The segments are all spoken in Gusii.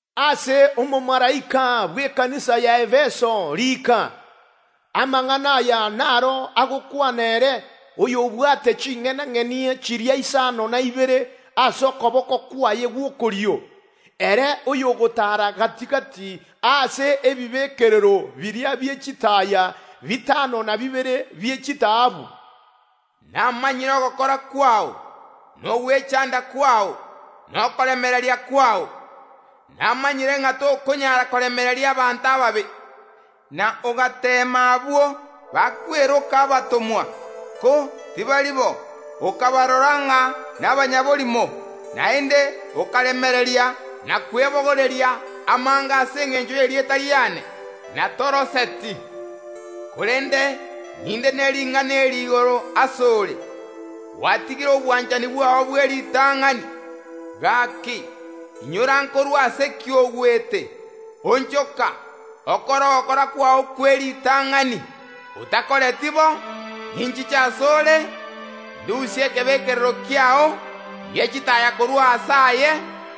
Ase omomalaika bw’ekanisa y’Efeso riika: Amang’ana aya naro agokwana, ere oyobwate ching’enang’eni chiria isano na ibere ase okoboko kwaye gw’okorio, ere oyogotaara gati‐gati ase ebibekerero biria bie chitaaya bitano na bibere bie chitaabu. Namanyire ogokora kwao, na ogwechanda kwao, na okoremereria kwao. Namanyire ng’a tokonyara koremereria abanto ababe, na ogateema abwo bakweroka abatomwa, ko tibari bo, okabarora ng’a nabanyaborimo. Naende okaremereria na kwebogoreria amange ase engencho y’erieta riane, na toroseti. Korende ninde ne ring’ana eri igoro ase ore: Gwatigire obwanchani bwao bw’eritang’ani. Gaki, inyora nkorwa ase ki ogwete. Onchoka, okore ogokora kwao kw’eritang’ani! Otakoreti bo, ninchiche asore, ndusie ekebekerero kiao gie chitaaya korwa aase aye.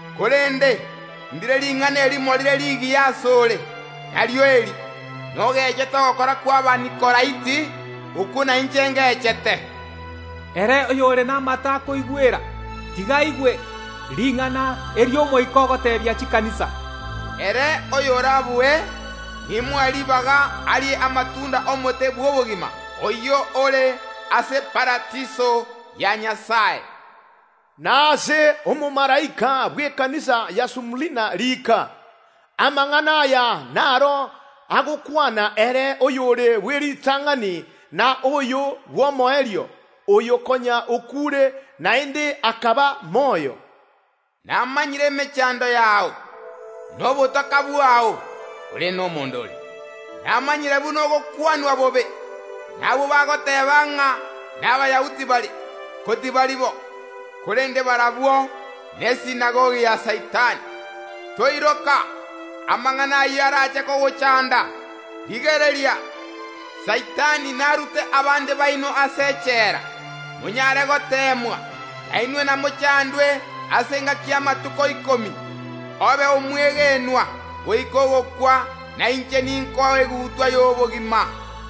Korende ndire ring’ana erimo rire rigiya ase ore, nario eri: Nogechete ogokora kw’Abanikolaiti, okwo nainche ngechete. Ere oyore namato akoigwera, tiga aigwe ring’ana eri Omoika ogoteebia chikanisa. Ere oyorabue nimoe ribaga arie amatunda y’omote bw’obogima, oyio ore ase Paradiso ya Nyasae. Na ase omomalaika bw’ekanisa ya Sumurina riika: Amang’ana aya naro agokwana, ere oyore bw’eritang’ani na oyo bw’omoerio, oyo konya okuure, naende akaba moyo. Namanyire emechando yao, na obotaka bwao (korende nomonda ore). Namanyire buna ogokwanwa bobe nabwo bagoteeba ng’a n’Abayahudi bare, ko tibari bo, korende barabwo n’ekeombe gia ya Saitani. Toiroka amang’ana ayio arache kogochanda. Rigereria, Saitani narute abande baino ase echela monyare goteemwa, na inwe namochandwe ase engaki y’amatuko ikomi. Obe omwegenwa goika ogokwa na inche ninkoe egutwa y’obogima.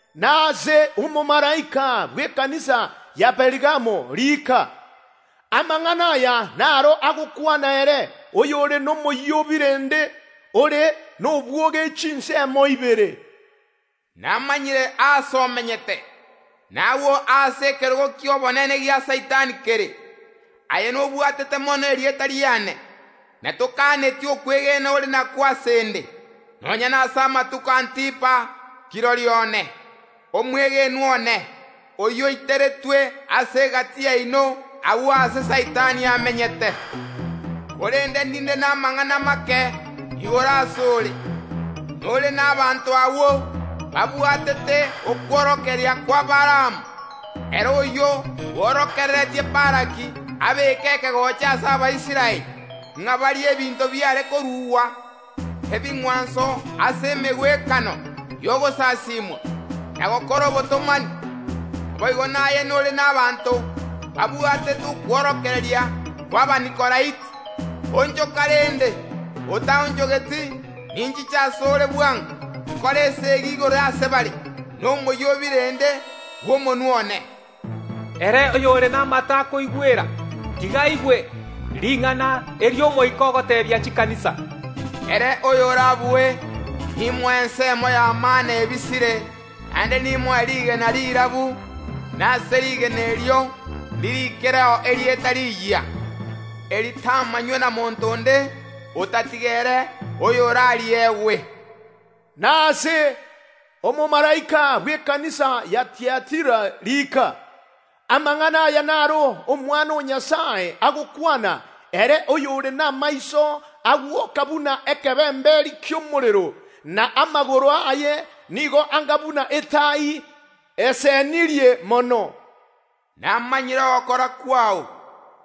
“Na ase omomalaika bw’ekanisa ya Perigamo riika: Amang’ana aya naro agokwana, ere oyore nomoyio o birende ore nobwoge chinsemo ibere. “Namanyire aase omenyete, nagwo aase ekerogo ki’obonene gia Saitani kere. Aye nobwatete mono erieta riane, na tokaneti okwegena ore nakwo ase inde, nonya nase amatuko Antipa kirori one, omwegenwa one, oyio oiteretwe ase egati yaino agwo aase Saitani amenyete. Korende ninde namang’ana make igoro ase ore: Nore nabaanto agwo babwatete okworokereria kwa Baalamu, ere oyio bworokereretie Balaki abeeke ekegocha ase Abaisraeli, ng’a barie ebinto biare korugwa ebing’wanso ase emegwekano y’ogosasimwa, na gokora obotomani. Naboigo naye nore nabaanto babwatete okworokereria kw’Abanikolaiti. Onchoka rende! Otaonchogeti, ninchiche ase ore bwango, nkore esegi igoro ase bare nomoyio o birende bw’omonwa one. Ere oyore namato akoigwera, tiga aigwe ring’ana eri Omoika ogoteebia chikanisa. Ere oyorabue nimoe ensemo ya mana ebisire, naende nimoe rigena rirabu, na ase rigena erio ndirikireo erieta riyia, eritamanywe na monto onde otatiga ere oyo orariegwe. “Na ase omomalaika bw’ekanisa ya Tiatira riika: Amang’ana aya naro Omwana o Nyasae agokwana, ere oyore namaiso agwoka buna ekebemberi ki’omorero, na amagoro aye nigo anga buna etai esenirie mono. “Namanyire ogokora kwao,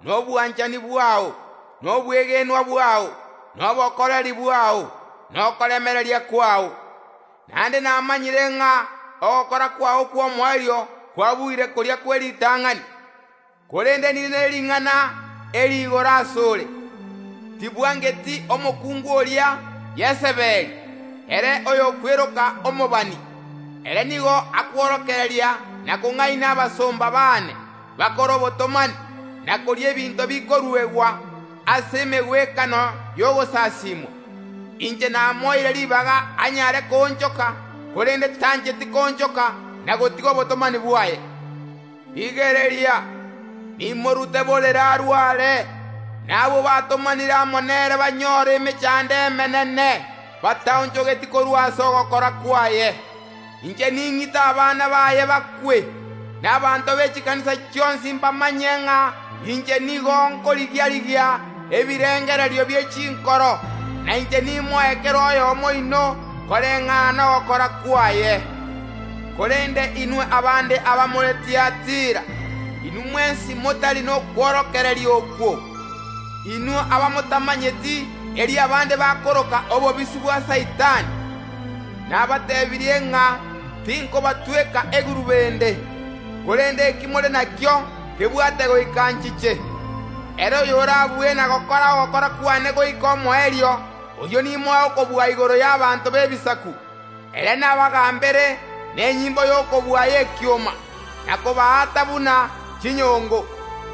na obwanchani bwao, na obwegenwa bwao, na obokoreri bwao, na okoremereria kwao. Naende namanyire ng’a ogokora kwao kw’omoerio kwabuire koria kw’eritang’ani. Korende ninde ne ring’ana eri igoro asore: Tibwangeti omokungu oria Yesebeli ere oyokweroka omobani o Nyasae. Ere nigo akworokereria na kong’aina abasomba baane bakore obotomani, na koria ebinto bikoruegwa ase emegwekano y’ogosasimwa. Inche namoeire ribaga anyare koonchoka, korende tancheti koonchoka na gotiga obotomani bwaye. Rigereria, nimorute borere arware, na abwo batomanire amo nere banyore emechando emenene, bataonchogeti korwa ase ogokora kwaye. Inche ning’ite abana baye bakwe. Na abanto be chikanisa chionsi mbamanye ng’a inche nigo nkoriga‐rigia ebirengererio bie chinkoro, na inche nimoe kera oyomo oino koreng’ana nogokora kwaye. Korende inwe abande abamore Tiatira, inwe mwensi motari nokworokereria okwo, inwe abamotamanyeti eri abande bakoroka obobisi bwa Saitani, nabateebirie ng’a tinkobatweka egurube ende. Korende eki more nakio kebwate goika nchiche. Ere oyorabue na gokora ogokora kwane goika omoerio, oyio nimoe okobua igoro y’abanto b’ebisaku, ere nabagambere nenyimbo y’okobua y’ekioma, na kobaata buna chinyongo.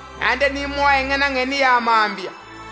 Naende nimoe eng’enang’eni ya mambia.